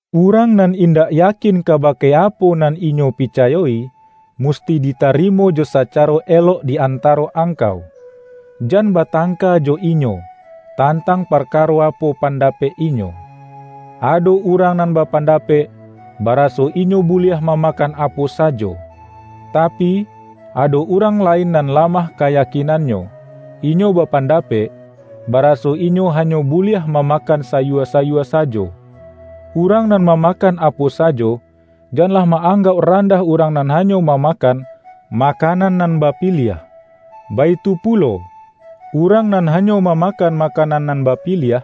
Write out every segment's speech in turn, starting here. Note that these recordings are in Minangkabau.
Urang nan indak yakin kabake apo nan inyo picayo-i, musti ditarimo jo sacaro elok di antaro angkau. Jan batangka jo inyo, tantang parkaro apo pandapek inyo. Ado urang nan bapandapek, baraso inyo buliah mamakan apo sajo. Tapi, ado urang lain nan lamah kayakinannyo; inyo bapandapek, baraso inyo hanyo buliah mamakan sayua-sayua sajo. Urang nan mamakan apo sajo, janlah ma-anggauk randah urang nan hanyo mamakan, makanan nan bapiliah; baitu pulo, urang nan hanyo mamakan makanan nan bapiliah,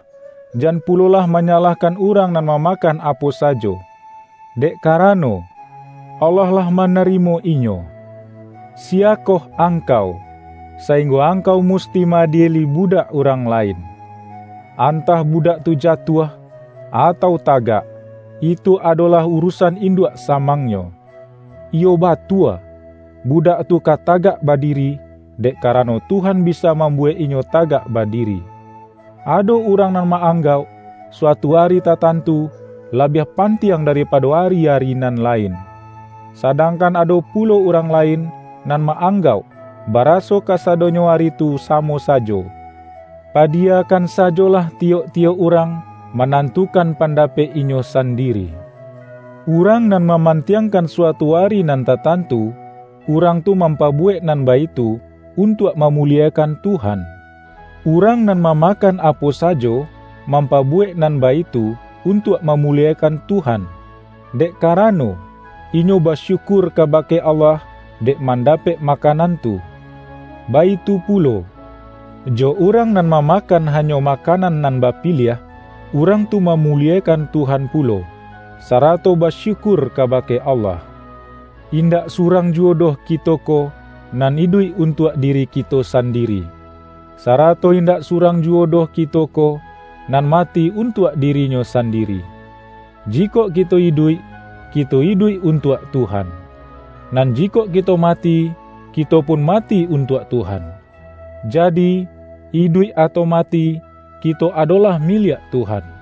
jan pulolah manyalahkan urang nan mamakan apo sajo, dek karano, Allah lah manarimo inyo. Siyakoh angkau, sainggo angkau musti ma-adieli budak urang lain? Antah budak tu jatuah, atau tagak, itu adolah urusan induak samangnyo. Iyo, batua, budak tu ka tagak badiri, dek karano Tuhan bisa mambuwek inyo tagak badiri. Ado urang nan ma-anggauk, suatu ari tatantu, labiah pantiang daripado ari-ari nan lain, sadangkan ado pulo urang lain nan ma-anggauk, baraso kasadonyo ari tu samo sajo. Padiyakan sajolah tiyok-tiyok urang manantukan pandapek inyo sandiri. Urang nan mamantiangkan suatu ari nan tatantu, urang tu mampabuwek nan baitu, untuak mamuliekan Tuhan. Urang nan mamakan apo sajo, mampabuwek nan baitu, untuak mamuliekan Tuhan, dek karano, inyo basyukur kabake Allah dek mandapek makanan tu. Baitu pulo, jo urang nan mamakan hanyo makanan nan bapiliah; urang tu mamuliekan Tuhan pulo, sarato basyukur kabake Allah. lndak surang juwo doh kito ko, nan iduik untuak diri kito sandiri; sarato indak surang juwo doh kito ko, nan mati untuak dirinyo sandiri. Jikok kito iduik, kito iduik untuak Tuhan. Nan jikok kito mati, kito pun mati untuak Tuhan. Jadi, iduik atau mati, kito adolah miliak Tuhan.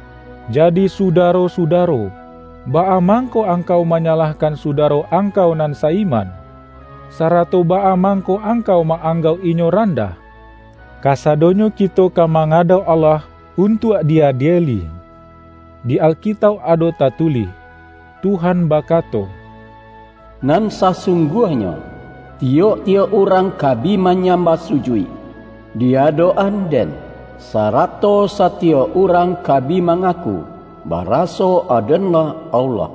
Jadi sudaro-sudaro! Baa mangko angkau manyalahkan sudaro angkau nan sa-iman? Sarato baa mangko angkau ma-anggauk inyo randah? Kasadonyo kito ka mangadauk Allah untuak di-adieli. Di Alkitauk ado tatulih, Tuhan bakato,”Nan sasungguahnyo, tiyok-tiyok urang ka bi manyambah sujuik di adok-an Den; sarato satiyok urang ka bi mangaku, baraso Aden-lah Allah.”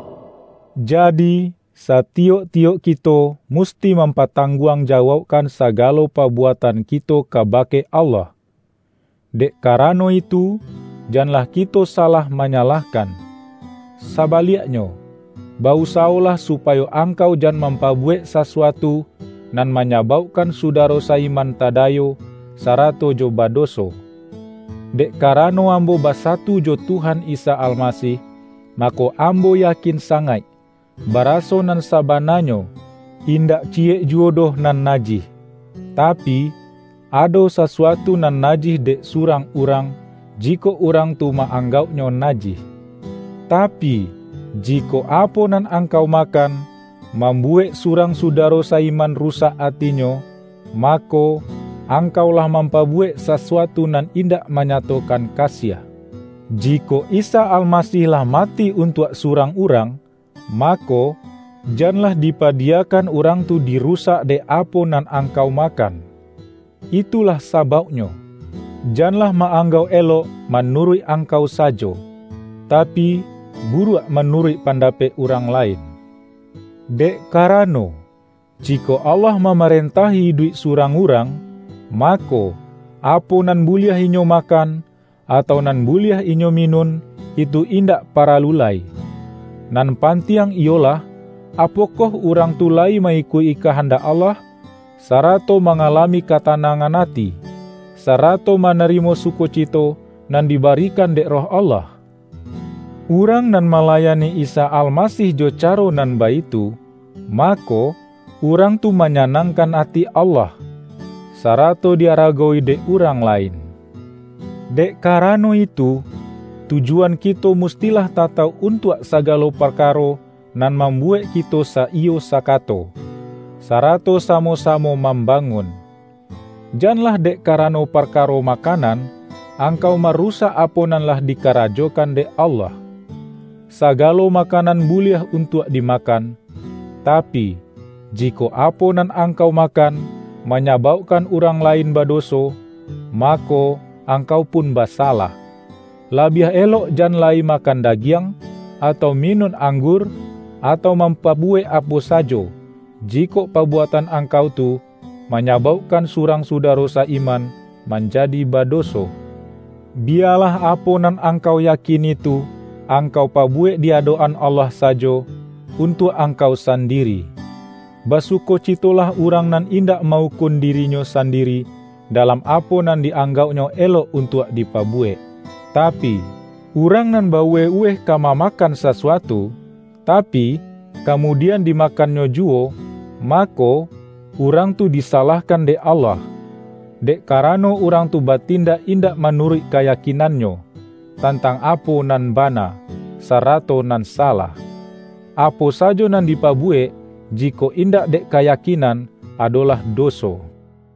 Jadi, satiyok-tiyok kito musti mampatangguang jawaukkan sagalo pabuatan kito kabake Allah. Dek karano itu, janlah kito salah manyalahkan. Sabaliaknyo, ba-usawolah supayo angkau jan mampabuwek sasuatu, nan manyabaukkan sudaro sa-iman tadayo, sarato jo badoso. Dek karano ambo basatu jo Tuhan Isa Almasih, mako, ambo yakin sangaik, baraso nan sabananyo, indak ciyek juwo doh nan najih; tapi, ado sasuatu nan najih dek surang urang, jikok urang tu ma-anggauknyo najih. Tapi, jikok apo nan angkau makan, mambuwek surang sudaro sa-iman rusak atinyo, mako, angkau lah mampabuwek sasuatu nan indak manyatokan kasiah. Jikok Isa Almasih lah mati untuak surang urang, mako, janlah dipadiyakan urang tu dirusak dek apo nan angkau makan. Itulah sabauknyo, janlah ma-anggauk elok manuruik angkau sajo, tapi, buruak manuruik pandapek urang lain. Dek karano, jikok Allah mamarentahi iduik surang urang, mako, apo nan buliah inyo makan, atau nan buliah inyo minun, itu indak paralu lai. Nan pantiang iyolah, apokoh urang tu layi ma-ikuik-i kahandak Allah, sarato mangalami katanangan ati, sarato manarimo sukocito nan dibarikan dek Roh Allah? Urang nan malayani Isa Almasih jo caro nan baitu, mako, urang tu manyanangkan ati Allah, sarato di-aragowi dek urang lain. Dek karano itu, tujuan kito mustilah tatauk untuak sagalo parkaro nan mambuwek kito saiyo sakato, sarato samo-samo mambangun. Janlah dek karano parkaro makanan, angkau marusak apo nan lah dikarajokan dek Allah. Sagalo makanan buliah untuak dimakan; tapi, jikok apo nan angkau makan, manyabaukkan urang lain badoso, mako, angkau pun basalah. Labiah elok jan lai makan dagiang, atau minun anggur, atau mampabuwek apo sajo, jikok pabuatan angkau tu manyabaukkan surang sudaro sa-iman, manjadi badoso. Biyalah apo nan angkau yakini tu, angkau pabuwek di adok-an Allah sajo, untuak angkau sandiri. Basukocitolah urang nan indak ma-ukun dirinyo sandiri, dalam apo nan di-anggauknyo elok untuak dipabuwek. Tapi, urang nan ba-uweh-uweh ka mamakan sasuatu, tapi, kamudian dimakannyo juwo, mako, urang tu disalahkan dek Allah; dek karano urang tu batindak indak manuruik kayakinannyo, tantang apo nan bana, sarato nan salah. Apo sajo nan dipabuwek, jikok indak dek kayakinan, adolah doso. ROMA